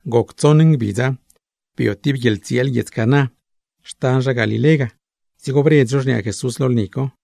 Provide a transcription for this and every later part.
Goc tsoṉ ngbidza, bio tib guieḻtsieel guiedz Caná, xtan zha Galilé ga. Dzigo bredz zho xniaa Jesús lo lni co,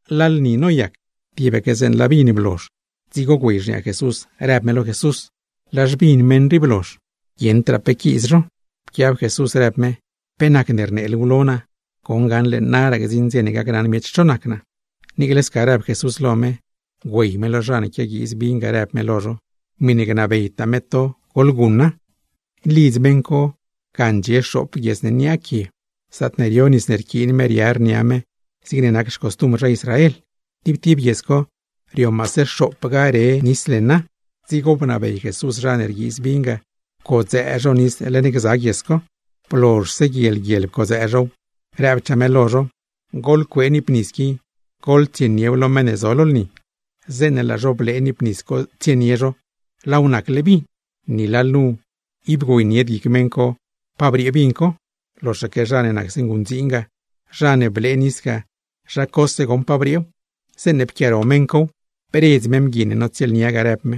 Laa lni noyac, tibaque zeeṉe laa vin blozh. Dzigo güey xniaa Jesús rëb me lo Jesús: ―Laa xvin meṉ rii blozh. ¡Guieṉdraa pe quiiz zho! Pquiab Jesús rëb me: ―¿Pe nacne rnee luuw lo naa? Goṉ gaṉle naraa gdziṉ dze ne gacnaṉ miech cho nac naa. Niicle sca rëb Jesús lo me, güey me lo zha ne quiaguiiz vin ga rëb me lo zho: ―Miṉe gnabeytaa me to, goḻguṉa. Lidz meṉ co ga ndxie xoop guies ne niaa quie; zaatne rio nis ne rquiin zha Israel riar nia zho, zigne nac grë xcostumbr zho. Tib tib guies co, rio maase xoopga re nis leṉa. Dzigo bnabey Jesús zha ne rguiiz vin ga pcodzëë zho nis leṉ gza guies co. Blozhse guiel guiel pcodzëë zhow, rëbchaa me lo zho: ―Goḻcuee niip nis qui, goḻtsieniew lo meṉ ne zo lo lni. Zeeṉe laa zho blee niip nis co tsienie zho, laaw nacle vin. Ni lalnu ib güeynied guic meṉ co pa briee vin co (loxaque zha ne nacse nguṉdziin ga, zha ne blee nis ga, zha cose goṉ pa brieew), zeeṉe pquiaaro mew, bredz me mgui ne notsieelnia ga, rëb me: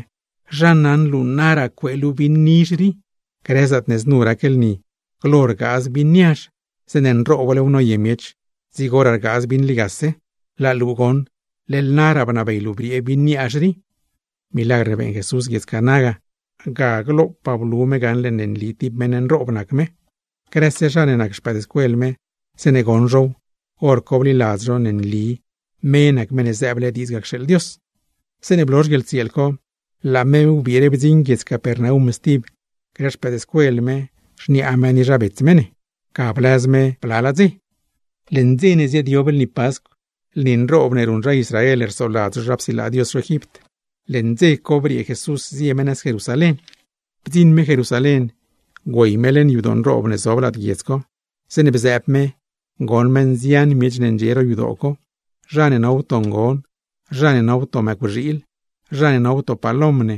―¡Zha naṉ luu naraa cuee luu vin rii! Grëtaa zaatne znu rac lni, glo rgaaz vin niazh, zeeṉe nrooblew noye zho, dzigo rgaaz vin ligase. Laa luu goṉ leḻ naraa bnabey luu briee vin niazh. Milagr ne beeṉ Jesús guiedz Caná ga, ga glopaa blu me lo miech gaṉle nli tib meṉ nroob nac me. Grëse no ne nac no xpëëdscuel me, zeeṉe bdzioṉ now, hor co bliladz no nli me nac Meṉ ne zëëble diidz ga cxeeḻ Dios. Zeeṉe blozh guieḻtsieel co, laa no wbire guiedz Capernaum stib grë no me, xniaa me, ni zha bets me ne. Bdziṉ no Capernaum, ga bliaaz no blalaa ngbidz. Leṉ dze ne ziaadyob lni Pascw, lni nroob ne ruṉ zha Israel rsoladz zho zha psilaa Dios zho Egipt, leṉ dze co briee Jesús zie me nëz Jerusalén. Bdziṉ me Jerusalén, güey me leṉ yadoo nroob ne zob lad guiedz co. Zeeṉe bzëëb me, goṉ me nzian miech ne ndxie ro yadoo co, zha ne no wto ngon, zha ne no wto mëcwxiil, zha ne no wto palom ne,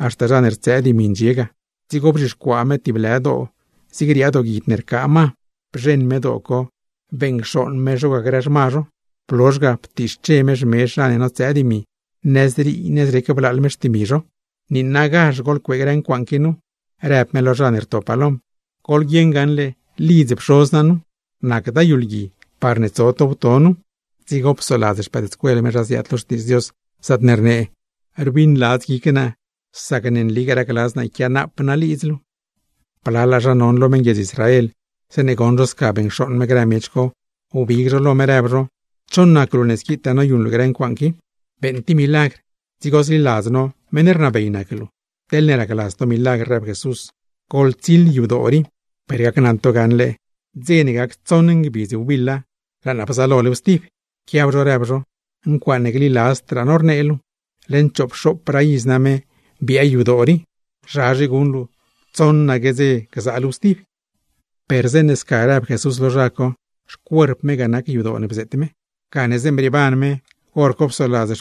haxta zha ne rtsëë dimi ndxie ga. Dzigo bzhixcuaa me tib lë doo zig riaa dooguid ne rcaa ma, bzheṉ me doo co beṉcxooṉ me zho ga grë xma zho; blozh ga, ptiixche me xmezh zha ne notsëë dimi ga, nëzrii nëzrec blaaḻ me xtimi zho. ―¡Niinagazh goḻcuee grë ncuaaṉ qui nu! ―rëb me lo zha ne rto palom―. ¡Goḻguieṉ gaṉle lidz Pxoz naa nu! ¡Nacda yu lgui parne tso to wto nu! Dzigo psoladz no zha ziaad lo Xtiidz Dios, zaatne rnee: “Rbiṉladz guic naa, sac ne nligaa racladz naa yquiaanap naa lidz luu.” Blalaa zha non lo meṉguiedz Israel, zeeṉe goṉ zho sca beṉcxooṉ me grë miech co, wbig zho lo me rëb zho: ―¿Cho nac luu ne squitaa noyuṉ luu grë ncuaaṉ qui? ¡Beeṉ tib milagr, dzigo zliladz no meṉ rnabey nac luu! ―Teḻne racladz to milagr ―rëb me―; goḻtsiḻ yadoo rii, ni gni naa lo to gaṉle ngbidz tsoṉa laa naa bzaalolew stib. Pquiab zho rëb zho: ―¡Ncuaaṉe gliladzdraa no rnee luu! ¡Leṉ choopxoopraa iz name biaa yadoo rii! ¿Zhazhe guṉ luu, tsoṉaque ngbidz gzaa luuw stib? Per zeeṉe sca bnee Jesús lo zho, xcuerp me ga nac yadoo ne bzeet me. Gane zeeṉe brieeban me, hor co psoladz no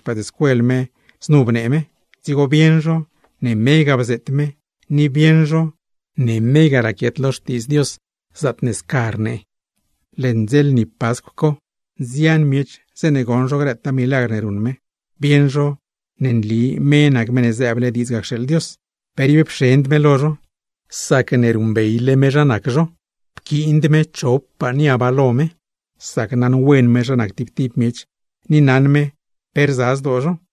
zeeṉe znu bnee me, dzigo bieṉ no ne me ga bzeet me ni bieṉ no ne me ga raquiet lo Xtiidz Dios zaatne scaque rnee. Leṉ dze lni Pascw co, nzian miech zeeṉe goṉ zho grëtaa milagr ne ruṉ me, bliladz zho ne nli me nac Meṉ ne zëëble diidz ga cxeeḻ Dios. Per ib pxend me lo zho, sacne naṉwen me zha nac zho tib tib zho. Pquiind me chopaa niab lo me zha nac zho; sac naṉwen me zha nac tib tib miech ni naṉ me pe rza zdoo zho.